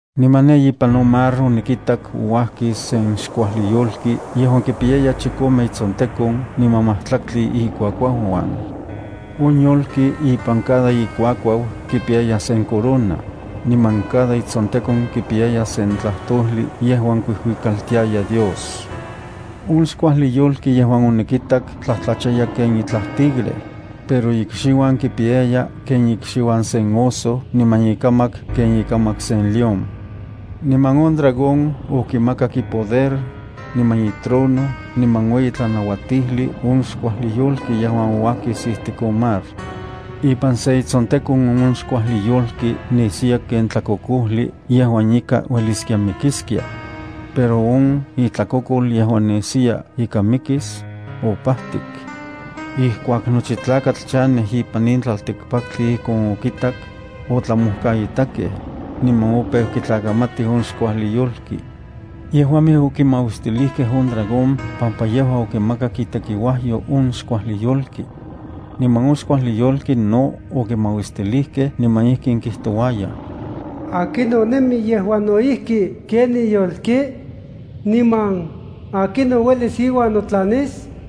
Niman ne ipan on mar onikitak ouajkis sen xkuajli yolki yejuan kipiyaya chikome itsontekon niman majtlaktli ikuakuauuan. On yolki ipan cada ikuakuau kipiyaya sen corona, niman cada itsontekon kipiyaya sen tlajtojli yejuan kuijuikaltiaya Dios. On xkuajli yolki yejuan onikitak tlajtlachaya ken itlaj tigre, pero ikxiuan kipiyaya ken ikxiuan sen oso niman ikamak kipiyaya ken ikamak sen león. Niman on dragón okimakak ipoder, niman itrono niman ueyi tlanauatijli, on xkuajli yolki yejuan ouajkis ijtik on mar. Ipan se itsontekon on xkuajli yolki nesiya ken tlakokojli yejuan ika ueliskia mikiskia. Pero on itlakokol yejuan nesiya ika mikis, opajtik. Ijkuak nochi tlakatl chanej ipan in tlaltikpaktli ijkon okitak, otlamojkaitakej, niman opeu kitlakamatij on xkuajli yolki. Yejuamej okimauistilijkej on dragón pampa yejua okimakak itekiuajyo on xkuajli yolki. Niman on xkuajli yolki no okimauistilijkej niman ijkin kijtouayaj: “¿Akinon nemi yejuan no ijki ken in yolki? Niman, ¿akinon uelis iuan notlanis?”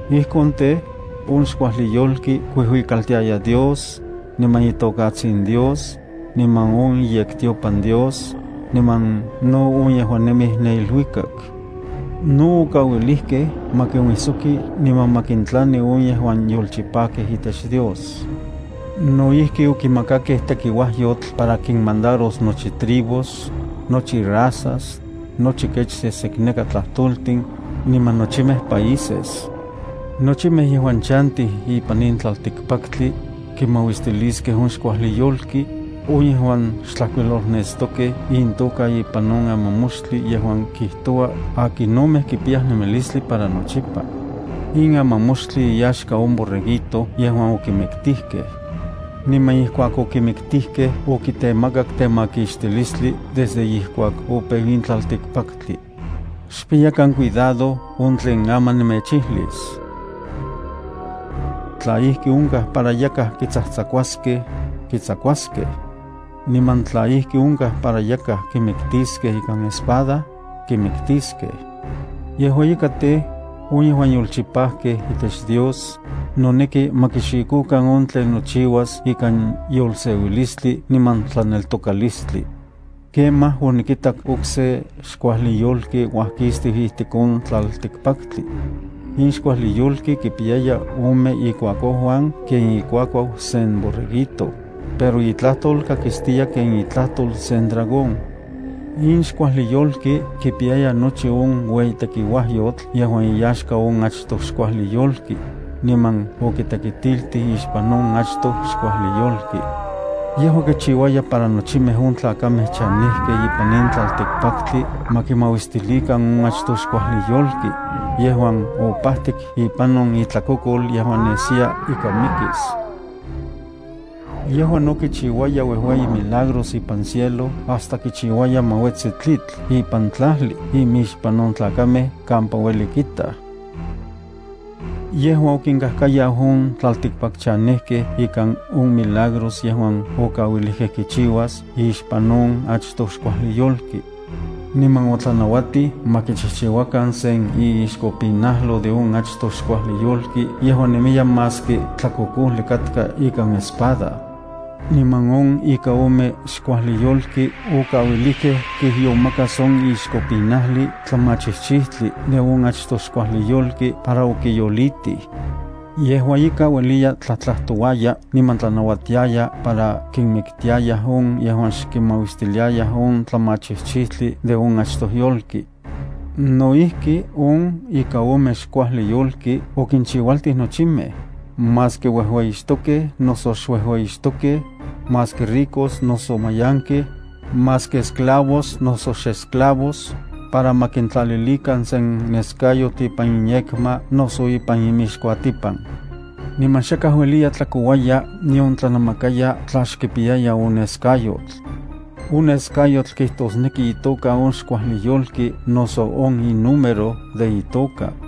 Ijkon tej, on xkuajli yolki kuijuikaltiaya Dios, niman itokatsin Dios, niman on iyektiopan Dios, niman no on yejuan nemij ne iluikak. No okauilijkej ma kinuijsoki niman ma kintlani on yejuan yolchipajkej itech Dios. No ijki okimakakej tekiuajyotl para kimandaros nochi tribus, nochi razas, nochi kech sesekneka tlajtoltin, niman nochimej países. Nochimej yejuan chantij ipan in tlaltikpaktli, kimauistiliskej on xkuajli yolki, on yejuan xtlajkuilolnestokej intoka ipan on amamoxtli, yejuan kijtoua akinomej kipiyaj nemilistli para nochipa. In amamoxtli iyaxka on Borreguito yejuan okimiktijkej. Niman ijkuak okimiktijkej okitemakak temakixtilistli desde ijkuak opeu in tlaltikpaktli. Xpiyakan cuidado on tlen aman nemechijlis: “Tla ijki onkaj para yakaj kitsajtsakuaskej, kitsakuaskej. Niman tla ijki onkaj para yakaj kimiktiskej ikan espada, kimiktiskej.” Yejua ika tej, on yejuan yolchipajkej itech Dios, noneki ma kixikokan on tlen nochiuas ikan yolseuilistli niman tlaneltokalistli.” Kemaj, onikitak okse xkuajli yolki uajkistiu ijtik on tlaltikpaktli. In xkuajli yolki kipiyaya ome ikuakuauuan ken ikuakuau sen borreguito, pero itlajtol kakistiya ken itlajtol sen dragón. In xkuajli yolki kipiyaya nochi on ueyi tekiuajyotl yejuan iyaxka on achtoj xkuajli yolki, niman okitekitiltij ixpan on achtoj xkuajli yolki. Yejua kichiuaya para nochimej on tlakamej chanejkej ipan in tlaltikpaktli ma kimauistilikan on achtoj xkuajli yolki, yejuan opajtik ipan on itlakokol yejuan nesiya ika mikis. Yejua no kinchiuaya uejueyi milagros ipan cielo hasta kichiuaya ma uetsi tlitl ipan tlajli imixpan on tlakamej kampa ueli kitaj. Yejua okinkajkayau on tlaltikpakchanejkej ikan on milagros yejuan okauilijkej kichiuas ixpan on achtoj xkuajli yolki. Niman otlanauatij ma kichijchiuakan sen iixkopinajlo de on achtoj xkuajli yolki yejuan nemiya maski tlakokojli katka ikan espada. Niman on ika ome xkuajli yolki okauilijkej kijyomakas on ixkopinajli tlamachijchijtli de on achtoj xkuajli yolki para okiyolitij. Yejua ika ueliya tlajtlajtouaya niman tlanauatiaya para kinmiktiayaj on yejuan xkimauistiliayaj on tlamachijchijtli de on achtoj yolki. No ijki on ika ome xkuajli yolki okinchiualtij nochimej, maski uejueyixtokej noso xuejueyixtokej, maski ricos noso mayankej, maski esclavos noso xesclavos, para ma kintlalilikan sen neskayotl ipan inyekma noso ipan imixkuatipan. Niman xakaj ueliya tlakouaya nion tlanamakaya tla xkipiyaya on neskayotl. On neskayotl kijtosneki itoka on xkuajli yolki noso on inúmero de itoka.